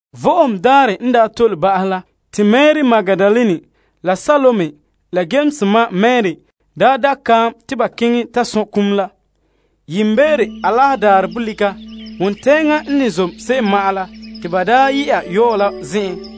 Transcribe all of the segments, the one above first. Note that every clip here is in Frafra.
Vo'ohogo Daarɛ n daa tole ba'ahɛ la, te Mari Magdalene la Yames ma Mari la Salome da' nyɛga kaam te ba keŋɛ ta sɔn' kum la. Yiimbeere Alaherɛ daarɛ bolika, wontɛɛŋa n ne zom se'em ma'an la, te ba yɛ'a yɔɔ la zen'en,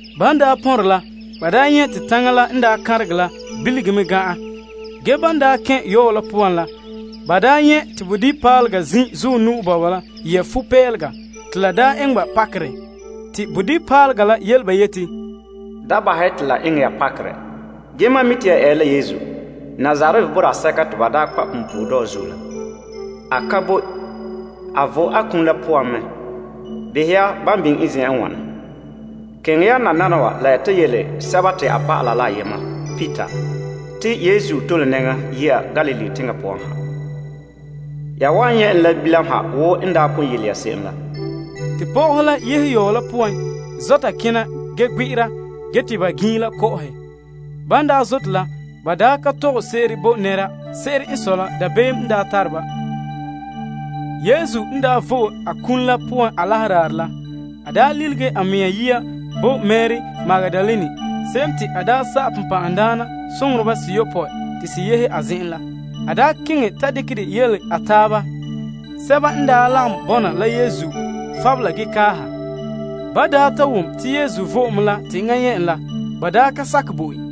Ban pɔnrɛ la, ba nyɛ' te taŋa la n kanrege la, bilige mɛ gan'an. Ge ban kɛn' yɔɔ la poan la, ba nyɛ' te bodibipaalega zin' zuɔ nu'o bɔba la yɛ' fupeelega, te la eŋɛ ba pakera. A la yele ba yeti, Da bahɛ ya te la eŋɛ ya pakerɛ, ge mam mi' te ya eere la Yesu Nazaret boraa sɛka te ba daa kpa' punpuuredɔɔ zuo la. A ka boe kalam. A vo'e a kum la poan mɛ! Behɛ ya, ban biŋe en zen'en n wana. Keŋɛ ya nananawa la ya ta yele a dɔlɔba la Peter, te a tole nɛŋa yɛ'a Galilee teŋa poan ha. Ya wan nyɛ' en bilam ha wo n daa pon yele ya se'em la. Te pɔgɔhe la yehe yɔɔ la poan zɔta kena ge gbe'era ge te ba giinla kɔ'ɔhɛ. Ba ka tɔgɛ sese'ere bo nɛra. Se'ere n sɔe la dabeem n daa tare ba. Yesu n daa vo'e a kum la poan Alaherɛ daarɛ la, a lilige a mɛŋa yia bo Mari Magdalene, se'em te a daa sa'ɛ bonbɛ'ɛhe seyopɔe te se yehe a zen'en la. A keŋɛ ta dekɛ de yele a taaba, sɛba n daa lagom bɔna la Yesu ge fabela ge kaaha. Ban ta wom te Yesu vo'e mɛ la, te enŋa nyɛ' en la, ba ka sakɛ bo en.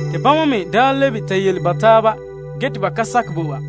Te bama me lebe ta yele ba taaba ge te ba ka sakɛ bo ba.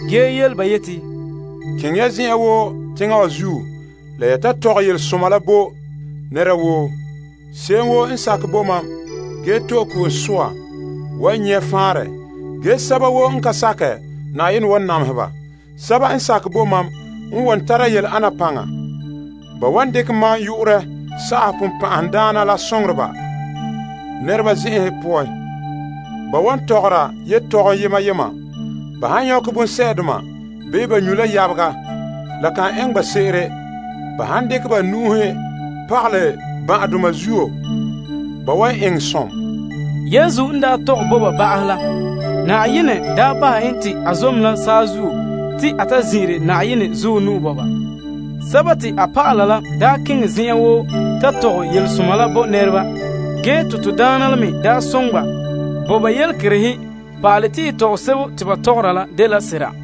A yele ba yeti, Keŋɛ ya zen'an woo teŋa wa zuo la ya mɔɔlɛ yelesoma la bo nɛra woo. Se'em woo n sakɛ bo mam ge to'e ko'om soa, wan nyɛ' faanrɛ. Ge sɛba woo n ka sakɛ, Yenɛ wan namehe ba. Sɛba n sakɛ bo mam n wan tara yele ana paŋa. Ba wan dekɛ mam yu'urɛ sa'ahɛ bonbɛ'ɛhe nɛreba zen'enhe poan. Ba wa tɔgɔra yetɔgom buuri buuri. Ba han nyɔkɛ bonsɛ'doma bii ba nyu' la yabega, la kan eŋɛ ba se'ere. Ba han dekɛ ba nu'uhe pagalɛ ban'ahedoma zuo, ba wan eŋɛ som. Yesu n tɔgɛ bo ba ba'ahɛ la, Yenɛ bahɛ en te a zom la saazuo te a ta zin'ire Na'ayenɛ zuɔ nu'o bɔba. A dɔlɔba la keŋɛ zen'an woo ta mɔɔlɛ yelesoma la bo nɛreba. Ge te Na'ayenɛ la me daa soŋɛ ba, bo ba yelekerehe pa'alɛ te yelese'a te ba mɔɔla la dela sera.